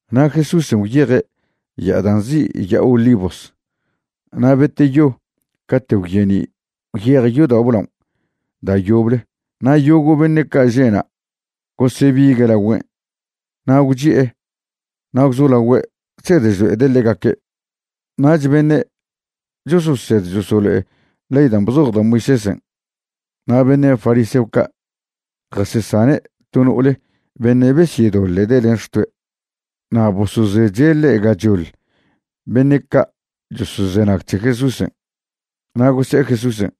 Na' Jesúsen' gwyeje' ya'a da' nzi' Ya'a Olivos. Na' beteyo cate' gwyeni' gwyeje' yodao' blaon' da' yoble na' yogo' beṉe' ca' že' na' gosebigue' lagüen' na' gwchi'e na' gwzolagüe' chsed chlo'ede' ḻegaque'. Nach beṉe' chososed chosolo'e ley dan' bzoj da' Moisésen' na' beṉe' fariseo ca' jasesane' to no'ole beṉe' besyedoḻe'de' len xtoe'. Na' bosozeche' ḻe' gachoḻ beṉe' ca' chosozenag c̱he Jesúsen'. Na' gose'e Jesúsen':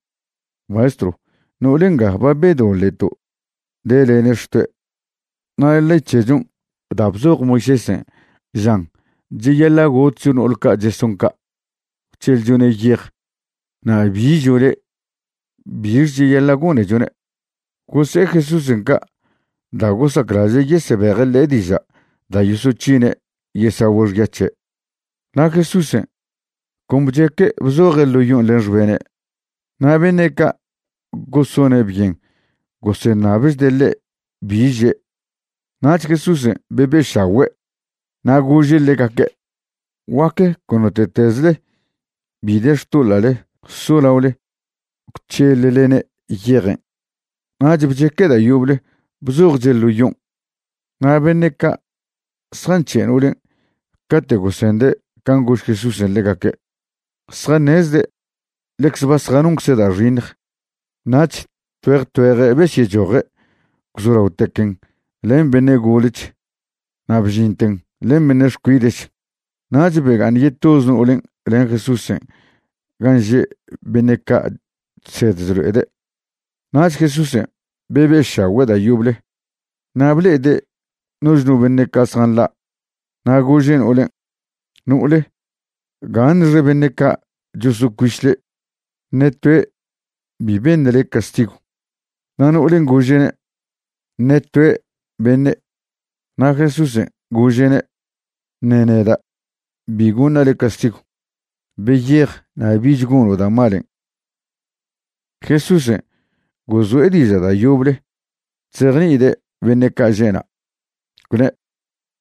―Maestrw, no'ole nga ba bedoḻe'to' delene' xtoe'. Na' ley c̱hechon' da' bzoj Moisésen' žan cheyaḻa' gotcho no'ol ca' cheson ca' gwc̱heḻchone' yej. Na' ¿bi žo' le'? ¿bix cheyaḻa' gonechone'? Gose'e Jesúsen' ca' da' gosaclaže' yesebeje' ḻe' diža' da' yosoc̱hine' yesagüe' xya c̱he'. Na' Jesúsen' con bcheque' bzoje' ḻo yon' len xbene'. Na' beṉe' ca' gosone' byen goseṉabchde' ḻe' bi že'. Nach Jesúsen' bebe'šagüe' na' gože' ḻegaque': ―Guaque con note'tezle bi de xtoḻa'le solaole gwc̱heḻlene' yejen'. Nach bcheque' da' yoble bzojche' ḻo yon'. Na' beṉe' ca' zjanc̱he' no'olen' cate' gosende' can' gož Jesúsen' ḻegaque', zjaṉezde' ḻecze ba zjanoncze' da' xiṉj, nach tgüeje tgüeje' besyechoje' gwzolaotequen' len beṉe' golech na' bžinten len beṉe' xcuide'ch, nach bega'aṉ yetoze no'olen' len Jesúsen' gan' že' beṉe' ca' chsed chlo'ede'. Nach Jesúsen' bebe'šagüe' da' yoble na' ble'ede' noch no beṉe' ca' zjanḻa' na' gože' no'olen': ―No'ole, ¿gaṉxe beṉe' ca' chosocuiš le'? ¿Ṉe toe' bi beṉ le' castigw? Na' no'olen' gože'ne': ―Ṉe toe', beṉe'. Na' Jesúsen' gože'ne': ―Ṉe neda' bi goṉa' le' castigw. Beyej na' bich gono' da' malen'. Jesúsen' gozo'e diža' da' yoble chzejni'ide' beṉe' ca' že' na', gwne':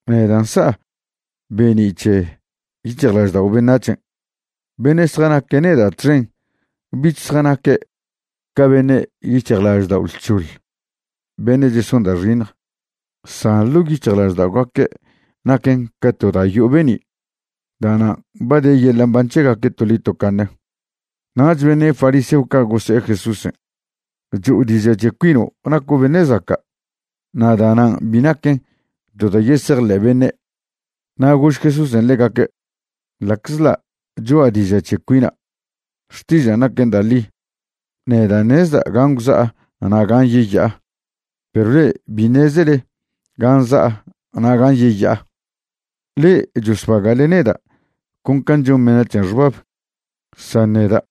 ―Neda' nsa'a be'ni' c̱he yic̱hjlaždao' beṉac̱hen'. Beṉe' zjanaque' neda' txen bich zjanaque' ca beṉe' yic̱hjlaždao' lc̱hoḻ beṉe' cheson da' xiṉj, san ḻo' yic̱hjlažda'ogaque' naquen ca to da' yo'o be'ni'. Da'nan' ba de yeḻa' mban c̱hegaque' toḻi tocaṉe. Nach beṉe' fariseo ca' gose'e Jesúsen': ―Cho'o diža' c̱he cuino' naco' beṉe' zaca', na' da'nan' bi naquen to da' yesejḻe' beṉe'. Na' gož Jesúsen' ḻegaque': ―Ḻa'czḻa' cho'a diža' c̱he cuina', xtižan' naquen da' ḻi. Neda' ṉezda' gan' gwza'a na' gan' yeya'a, perw le'e bi ṉezele gan' za'a na' gan' yeya'a. Ḻe'e chosbaga'le neda' con can' chon beṉac̱hen' xbab, san neda'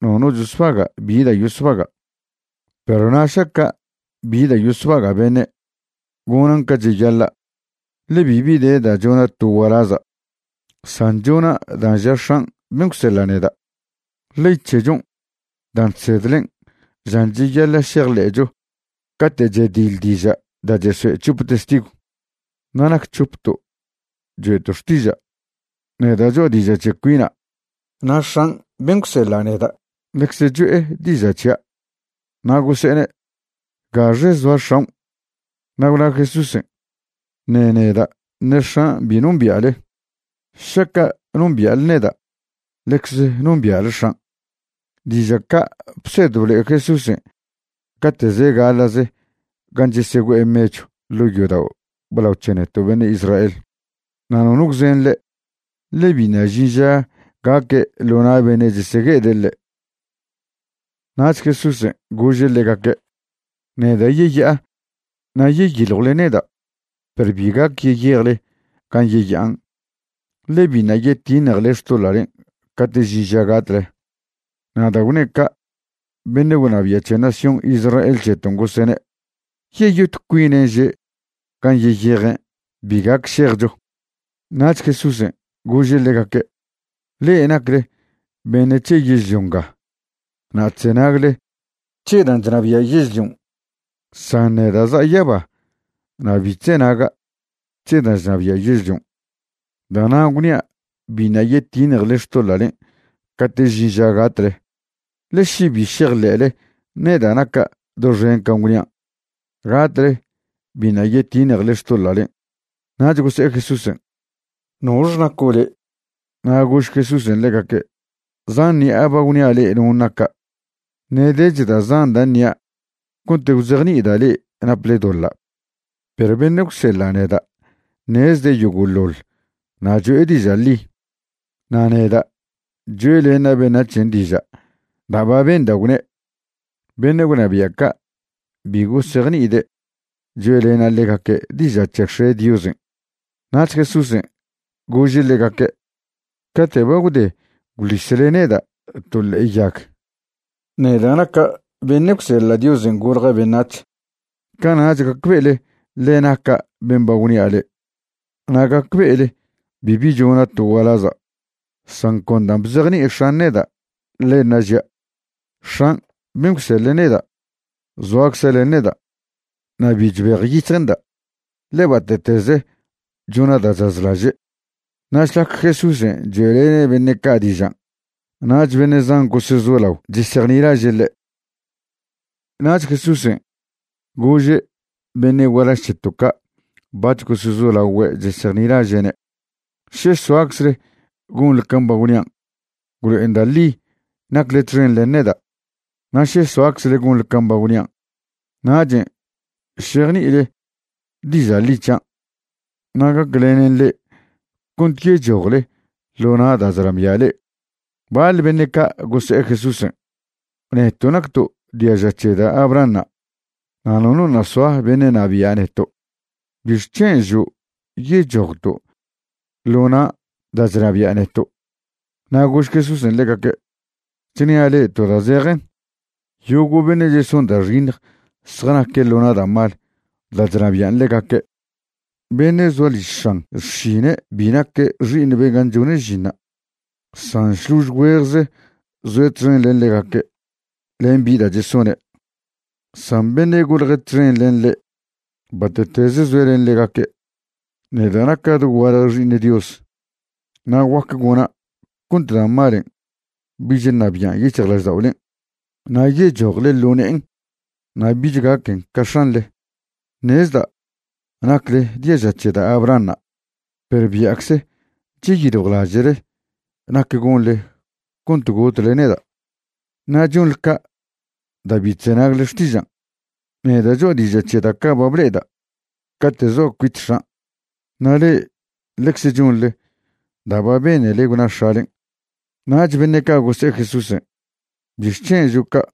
nono chosbaga' bi da' yosbaga'. Perw na' šaca' bi da' yosbaga' beṉe', gonan' ca cheyaḻa', ḻe bibi de da' chona' to gualaza', san chona' dan' ža X̱an' ben' gwseḻa' neda'. Ley c̱hechon' dan' chsedlen' žan cheyaḻa' šejḻe'cho cate' chediḻ diža' da' chesoe' c̱hope testigw. Na' nac c̱hopto' choe'to' xtiža': neda' cho'a diža' c̱he cuina' na' X̱an' ben' gwseḻa' neda' ḻecze cho'e diža' c̱hia'. Na' gose'ene': ―¿Gaxe zoa x̱aon'? Na' gwna Jesúsen': ―Ṉe neda' ṉe X̱an' bi nombia'le. Šaca' nombia'le neda' ḻecze nombia'le X̱an'. Diža' ca' bsed blo'e Jesúsen' cate' ze' gaḻa'ze gan' chesegüe'e mechw ḻo' yodao' blao c̱he neto' beṉe' Israel. Na' nono gwzen ḻe', ḻe biṉa' žin ža gaque' ḻo na' beṉe' chesegue'ede' ḻe'. Nach Jesúsen' gože' ḻegaque': ―Neda' yeya'a, na' yeyiljwle neda' perw bi gac yeyejle gan' yeya'an, ḻe biṉa' yetiṉjele xtoḻa'len' cate' žin ža gatle. Na' da' gwne' ca' beṉe' gwnabia' c̱he nación Israel c̱heton' gosene': ―¿Yeyot cuinen' že' gan' yeyejen' bi gac šejcho? Nach Jesúsen' gože' ḻegaque': ―Le'e nacle beṉe' c̱he yežlio nga na' chzenagle c̱he dan' chnabia' yežlion', san neda' za'a yaba na' bi chzenaga' c̱he dan' chnabia' yežlion'. Da'nan' gwnia' biṉa' yetiṉjele xtoḻa'len' cate' žin ža gatle. Ḻe še bi šejḻe'le neda' naca' doxen can' gwnian', gatle biṉa' yetiṉjele xtoḻa'len'. Nach gose'e Jesúsen': ―¿Nox naco' le'? Na' gož Jesúsen' ḻegaque': ―Zan ṉi'a ba gwnia' le'e non' naca'. Ṉe' dech da' zan da' ṉia' cont gwzejni'ida' le'e naple doḻa'. Perw beṉe' gwseḻa' neda' ṉezde' yogo'ḻoḻ na' cho'e diža' ḻi, na' neda' choe'lena' beṉac̱hen' diža' da' ba benda' gwne'. Beṉe' gwnabia' ca' bi gosejni'ide' choe'lene' ḻegaque' diža' c̱he X̱e' Diosen'. Nach Jesúsen' gože' ḻegaque': ―Cate' ba gwde gwḻisle neda' to ḻe'e yag, neda' naca' beṉe' gwseḻa' Diosen' golja' beṉac̱h, cana'ch gacbe'ele ḻe naca' ben' ba gwnia' le'e, na' gacbe'ele bibi chona' to gualaza', san con da' bzejni'i X̱an' neda', ḻenṉa' žia'. X̱an' ben' gwseḻe' neda' zoacze' len neda'. Na' bi chbejyic̱hje'nda', ḻe bate'teze chona' da' chazlaže'. Na' šlac Jesúsen' choe'lene' beṉe' ca' dižan' nach beṉe' zan gosezolao chesejnilaže' ḻe'. Nach Jesúsen' gože' beṉe' gualaž c̱heto' ca' bac̱h gosezolagüe' chesejnilaže'ne': ―Še soaczle gonḻe can' ba gwnian', gwlo'en da' ḻi nacle txen len neda'. Na' še soaczle gonḻe can' ba gwnian', nachen' šejni'ile diža' ḻi c̱hian' na' gaclenen le'e cont yechojle ḻo na' da' chnabia' le'e. Baḻ beṉe' ca' gose'e Jesúsen': ―Neto' nacto' diaža c̱he da' Abrahanṉa' na' nono ṉa' soa beṉe' ṉabia' neto'. ¿Bixc̱hen' žo' yechojto' ḻo na' da' chnabia' neto'? Na' gož Jesúsen' ḻegaque': ―Chnia' le'e to da' zejen, yogo' beṉe' cheson da' xiṉj zjanaque' ḻo na' da' mal da' chnabian' ḻegaque'. Beṉe' zoa liž x̱an xšine' bi naque' xi'iṉ ben' gan' chone' žinṉa', san šlož güejze zoe' txen len ḻegaque' len bi da' chesone'. San beṉe' golje' txen len ḻe', bate'teze zoe' len ḻegaque'. Neda' naca' dogualje Xi'iṉ Dios na' guac gona' cont da' malen' bich ṉabi'an yic̱hjlažda'olen' na' yechojle ḻo ne'en na' bich gaquen ca x̱anḻe. Ṉezda' nacle diaža c̱he da' Abrahanṉa', perw bia'cze cheyiljwlaže'le nac gonḻe cont gotle neda'. Na' chonḻe ca' da' bi chzenagle xtižan'. Neda' cho'a diža' c̱he da' ca' ba ble'eda' cate' zoa' cuit X̱an', na' le'e ḻecze chonḻe da' ba benele gwna x̱alen'. Nach beṉe' ca' gose'e Jesúsen': ―¿Bixc̱hen' žo' ca'?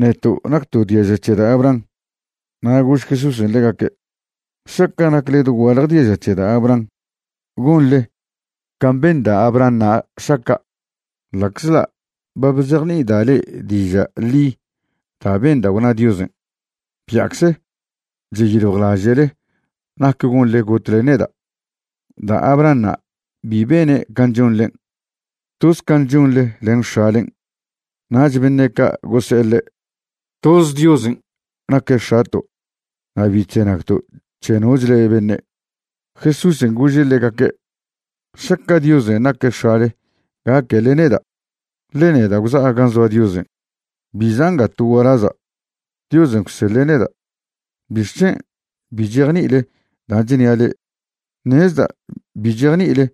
Neto' nacto' diaža c̱he da' Abraham. Na' gož Jesúsen' ḻegaque': ―Šaca' nacle dogualje diaža c̱he da' Abraham, gonḻe can' ben da' Abrahanṉa' šaca'. Ḻa'czḻa' ba bzejni'ida' le'e diža' ḻi da' benda' gwna Diosen', bia'cze cheyiljwlaže'le nac gonḻe gotle neda'. Da' Abrahanṉa' bi bene' can' chonḻen'. Toz can' chonḻe len x̱alen'. Nach beṉe' ca' gose'e ḻe': ―Toz Diosen' naque' X̱ato' na' bi chzenagto' c̱he nochle beṉe'. Jesúsen' gože' ḻegaque': ―Šaca' Diosen' naque' x̱ale gaquele neda', ḻe neda' gwza'a gan' zoa Diosen'. Bi za'a nga to gualaza', Diosen' gwseḻe' neda'. ¿Bixc̱hen' bi chejni'ile dan' chnia' le'e? Ṉezda' bi chejni'ile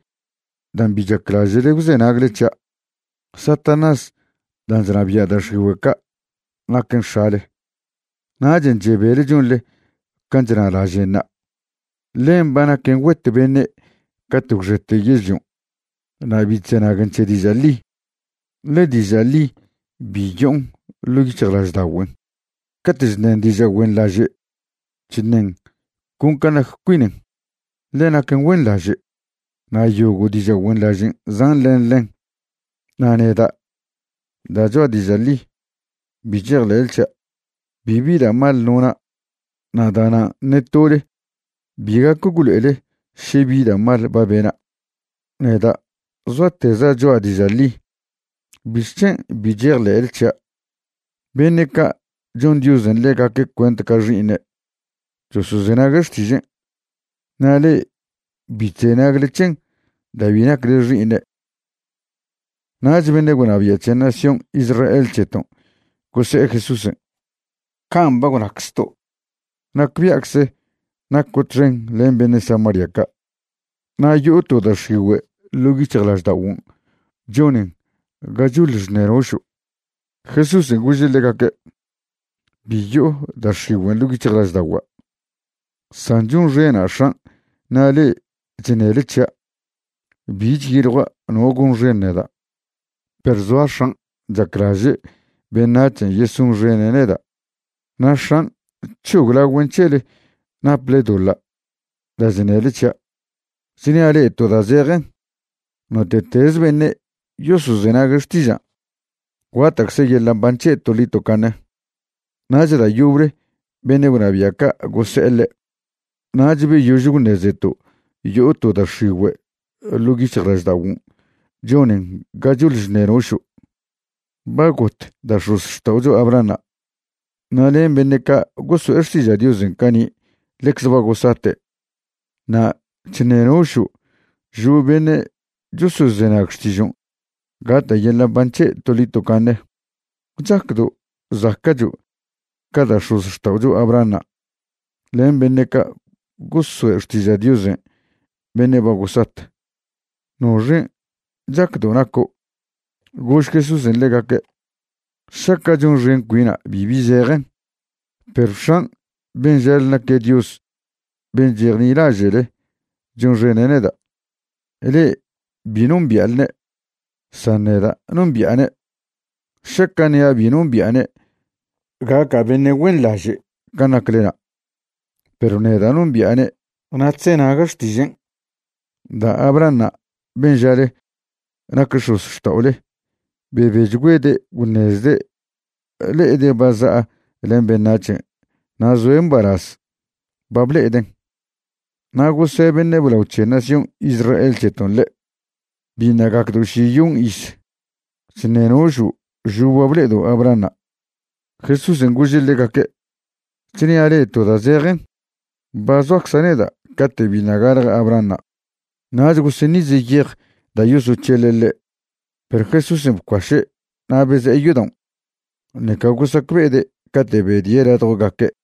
dan' bi chaclaže'le gwzenagle c̱hia'. Satanás dan' chnabia' da' x̱igüe' ca' naquen x̱ale, nachen' chebele chonḻe can' chnalažen'ṉa'. Ḻen ba naquen güet beṉe' cate' gwxete yežlion'. Na' bi chzenaguen c̱he diža' ḻi, ḻe diža' ḻi bi yo'on ḻo' yic̱hjlažda'ogüen. Cate' chṉen diža' güenḻaže' chṉen con can' nac cuinen, ḻe naquen güenḻaže' na' yogo' diža' güenḻažen' zan' len ḻen. Na' neda', da' cho'a diža' ḻi, bi chejḻe'le c̱hia'. Bibi da' mal nona' na' da'nan' ṉe tole bi gac gwlo'ele še bi da' mal ba bena'. Neda' zoateza' cho'a diža' ḻi, ¿bixc̱hen' bi chejḻe'le c̱hia'? Beṉe' ca' chon Diosen' ḻegaque' cuent ca xi'iṉe' chosozenague' xtižen'. Na' le'e bi chzenagle c̱hen' da' bi nacle xi'iṉe'. Nach beṉe' gwnabia' c̱he nación Israel c̱heton' gose'e Jesúsen': ―Can' ba gwnaczto' nacbia'cze naco' txen len beṉe' Samaria ca' na' yo'o to da' x̱igüe' ḻo' yic̱hjlažda'oguon' chonen ga choḻ chṉenošo'. Jesúsen' gože' ḻegaque': ―Bi yo'o da' x̱igüen' ḻo' yic̱hjlažda'ogua', san chonxena' X̱an' na' le'e chṉele c̱hia'. Bi chyiljua' no gonxen neda', perw zoa X̱an' chaclaže' beṉac̱hen' yesonxene' neda' na' X̱an' c̱hoglagüen' c̱hele naple doḻa' da' chṉele c̱hia'. Chnia' le'e to da' zejen, note'teze beṉe' yosozenague' xtižan', guata'cze yeḻa' mban c̱he' toḻi tocaṉe. Nach da' yoble beṉe' gwnabia' ca' gose'e ḻe': ―Nach beyož gwṉezeto' yo'o to da' x̱igüe' ḻo' yic̱hjlažda'oguon' chonen ga choḻ chṉenošo'. Ba got da' x̱ozxta'ocho Abrahanṉa', na' len beṉe' ca' goso'e xtiža' Diosen' cani' ḻecze ba gosate', na' chṉenošo' žo' beṉe' chosozenag xtižon' gata' yeḻa' mban c̱he' toḻi tocaṉe. ¿Chacdo' zaca'cho' ca da' x̱ozxta'ocho Abrahanṉa' len beṉe' ca' gosoe' xtiža' Dios beṉe' ba gosat? ¿Noxen' chacdo' naco'? Gož Jesúsen' ḻegaque': ―Šaca' chonxen cuina' bibi zejen, perw X̱an' ben' žale naque' Dios ben' chejnilaže'le chonxene' neda'. Le'e bi nombia'lne', san neda' nombi'ane'. Šaca' ṉia' bi nombi'ane' gaca' beṉe' güenḻaže' can' naclena'. Perw neda' nombi'ane' na' chzenaga' xtižen'. Da' Abrahanṉa' ben' žale nac x̱ozxta'ole bebechgüede' gwṉezde' le'ede' ba za'a len beṉac̱hen' na' zoe' mbalaz ba ble'eden'. Na' gose' beṉe' blao c̱he nación Israel c̱heton' ḻe': ―Biṉa' gacdo' šiyon iz. Chṉenošo' žo' ba ble'edo' Abrahanṉa'. Jesúsen' gože' ḻegaque': ―Chnia' le'e to da' zejen, ba zoacza' neda' cate' biṉa' galje Abrahanṉa'. Nach goseṉize' yej da' yosoc̱heḻe' ḻe', perw Jesúsen' bcuaše' na' beze'e yodaon'. Ṉeca gosacbe'ede' cate' bedie' ladjogaque'.